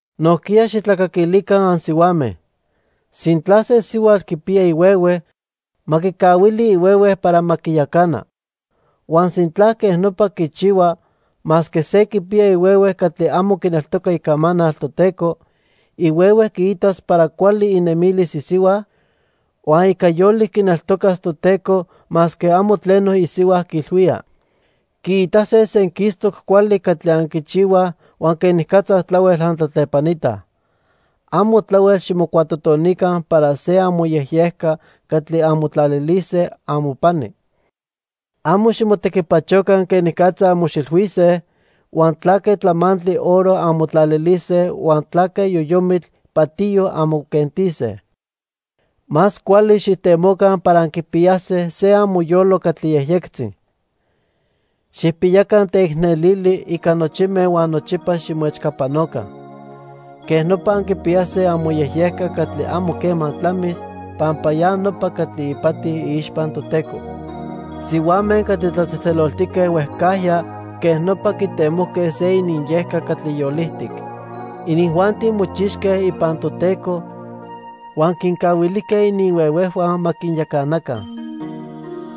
Nojquiya xijtlacaquilica ansihuame. Sintla se sihuatl quipiya ihuehue, ma quicahuili ihuehue para ma quiyacana. Huan sintla quej nopa quichihua, masque se quipiya ihuehue catli amo quineltoca icamanal Toteco, ihuehue quiitas para cuali inemilis isihua, huan ica yolic quineltocas Toteco masque amo tleno isihua quiilhuía. Quiitase senquistoc cuali catli anquichihuaj huan quenicatza tlahuel antlatlepanitaj. Amo tlahuel ximocuatotonica para se amoyejyejca catli anmotlalilise amopani. Amo ximotequipachoca quenicatza anmoxilhuise, huan tlaque tlamantli oro anmotlalilise huan tlaque yoyomitl patiyo anmoquentise. Más cuali xijtemoca para anquipiyase se amoyolo catli yejyectzi. Xijpiyaca teicnelili ica nochime huan nochipa ximoechcapanoca. Quej nopa anquipiyase amoyejyejca catli amo quema tlamis pampa ya nopa catli ipati iixpa Toteco. Sihuame catli tlatzejtzeloltique huejcajya quej nopa quitemojque se ininyejca catli yolijtic. Inijuanti mochixque ipan Toteco huan quincahuilijque ininhuehuejhua ma quinyacanaca.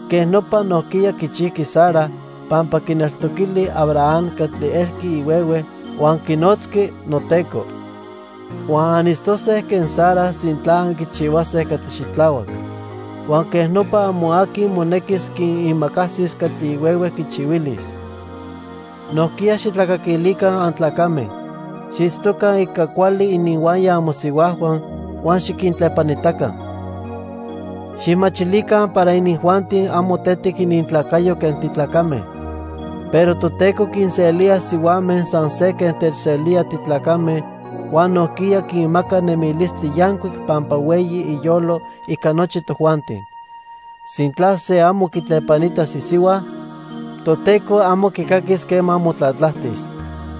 Quej nopa nojquiya quichijqui Sara, pampa quineltoquili Abraham catli elqui ihuehue huan quinotzqui "noteco". Huan anitztose quen Sara sintla anquichihuase catli xitlahuac. Huan quej nopa amo aqui monequis quiimacasis catli ihuehue quichihuilis. Nojquiya xijtlacaquilica antlacame. Xiitztoca ica cuali ininhuaya amosihuajhua huan xiquintlepanitaca. Xijmachilica para inijuanti amo tetic inintlacayo quen titlacame, pero Toteco quinselía sihuame san se quen techselía titlacame huan nojquiya quinmaca nemilistli yancuic pampa hueyi iyolo ica nochi tojuanti. Sintla se amo quitlepanitas isihua, Toteco amo quicaquis quema motlatlajtis.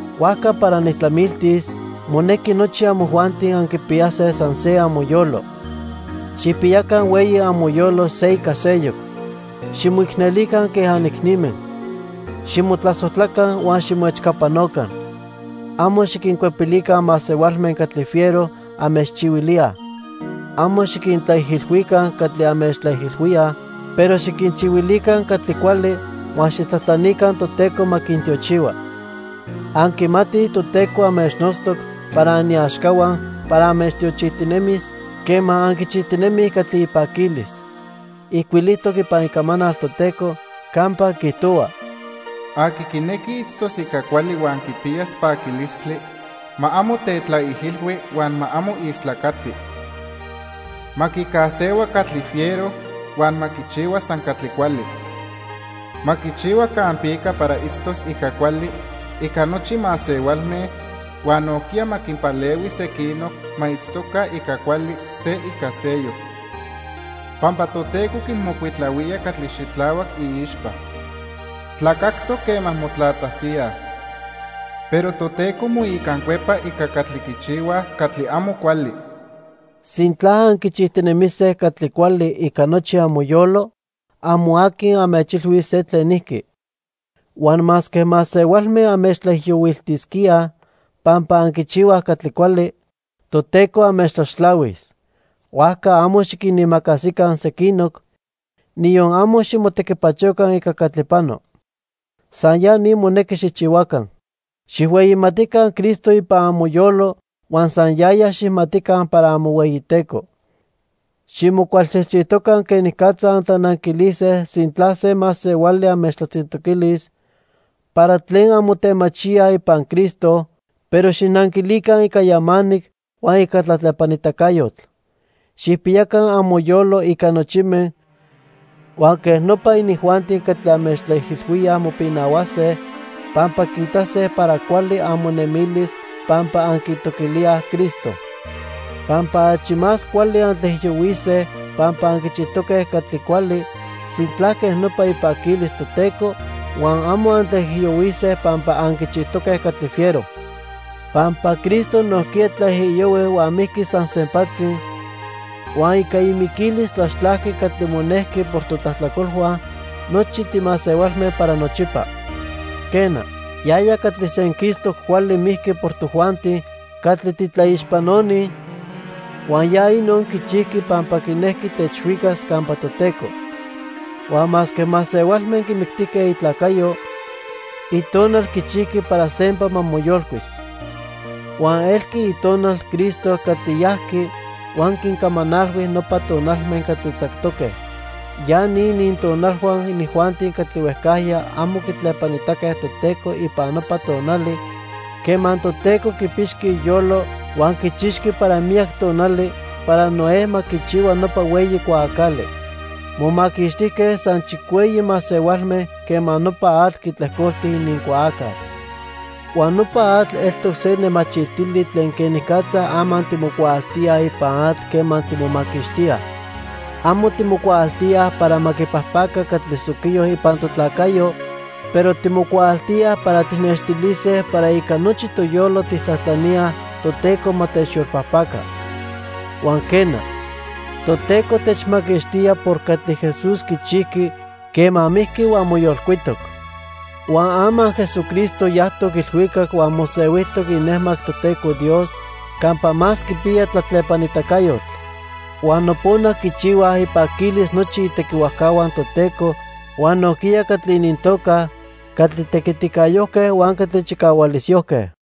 Huajca para nijtlamiltis, monequi nochi amojuanti anquipiyase san se amoyolo. Xijpiyaca hueyi amoyolo se ica seyoc. Ximoicnelica quen anicnime. Ximotlasojtlaca huan ximoechcapanoca. Amo xiquincuepilica masehualme catli fiero anmechchihuilíaj. Amo xiquintlaijilhuica catli anmechtlaijilhuíaj, pero xiquinchihuilica catli cuali huan xijtlajtlanica Toteco ma quintiochihua. Anquimatij Toteco anmechnotztoc para aniaxcahua para anmechtiochijtinemis quema anquichijtinemij catli ipaquilis. Ijcuilijtoc ipan Icamanal Toteco campa quiijtohua: "Aqui quinequi itztos ica cuali huan quipiyas paquilistli ma amo tetlaijilhui huan ma amo istlacati. Ma quicajtehua catli fiero huan ma quichihua san catli cuali. Ma quichihua campica para itztos ica cuali ica nochi masehualme, huan nojquiya ma quinpalehui sequinoc ma itztoca ica cuali se ica seyoc. Pampa Toteco quinmocuitlahuía catli xitlahuac iixpa. Tlacactoc quema motlatlajtíaj. Pero Toteco moicancuepa ica catli quichihuaj catli amo cuali." Sintla anquichijtinemise catli cuali ica nochi amoyolo, amo aqui anmechchihuilis se tlenijqui. Huan masque masehualme anmechtlaijiyohuiltisquíaj pampa anquichihuaj catli cuali, Toteco anmechtlaxtlahuis. Huajca amo xiquinimacasica sequinoc, niyon amo ximotequipachoca ica catli pano. San ya ni monequi xijchihuaca. Xijhueyimatica Cristo ipan amoyolo huan san yaya xijmatica para amohueyiTeco. Ximocualchijchijtoca quenicatza antlananquilise sintla se masehuali anmechtlatzintoquilis para tlen anmotemachíaj ipan Cristo, pero xijnanquilica ica yamanic huan ica tlatlepanitacayotl. Xijpiyaca amoyolo ica nochime, huan quej nopa inijuanti catli anmechtlaijilhuíaj mopinahuase, pampa quiitase para cuali amonemilis pampa anquitoquilíaj Cristo. Pampa achi más cuali antlaijiyohuise pampa anquichijtoque catli cuali, sintla quej nopa ipaquilis Toteco, huan amo antlaijiyohuise pampa anquichijtoque catli fiero. Pampa Cristo nojquiya tlaijiyohui huan mijqui san sempatzi, huan ica imiquilis tlaxtlajqui catli monejqui por totlajtlacolhua nochi timasehualme para nochipa. Quena, yaya catli senquistoc cuali mijqui por tojuanti catli titlaixpanoni, huan ya inon quichijqui pampa quinejqui techhuicas campa Toteco. Huan masque masehualme quimictijque itlacayo, itonal quichijqui para sempa ma moyolcuis. Huan elqui itonal Cristo catli yajqui huan quincamanalhui nopa tonalme catli tzactoque. Ya ni inintonalhua inijuanti catli huejcajya amo quitlepanitaque Toteco ipan nopa tonali quema Toteco quipixqui iyolo huan quichixqui para miyac tonali para Noé ma quichihua nopa hueyi cuaacali. Momaquixtijque san chicueyi masehualme quema nopa atl quitlejcolti inincuaacal. Huan nopa atl eltoc se nemachiltili tlen quenicatza ama timocuaaltíaj ipan atl quema timomaquixtíaj. Amo timocuaaltíaj para ma quipajpaca catli soquiyo ipan totlacayo, pero timocuaaltíaj para tijnextilise para ica nochi toyolo tijtlajtlaníaj Toteco ma techyolpajpaca. Huan quena, Toteco techmaquixtía por catli Jesús quichijqui quema mijqui huan moyolcuitoc. Huan ama Jesucristo yajtoc ilhuicac huan mosehuijtoc inejmac Toteco Dios campa más quipiya tlatlepanitacayotl. Huan nopona quichihuaj ipaquilis nochi itequihuajcahua Toteco huan nojquiya catli inintoca "catli tequiticayojque" huan "catli chicahualisyojque".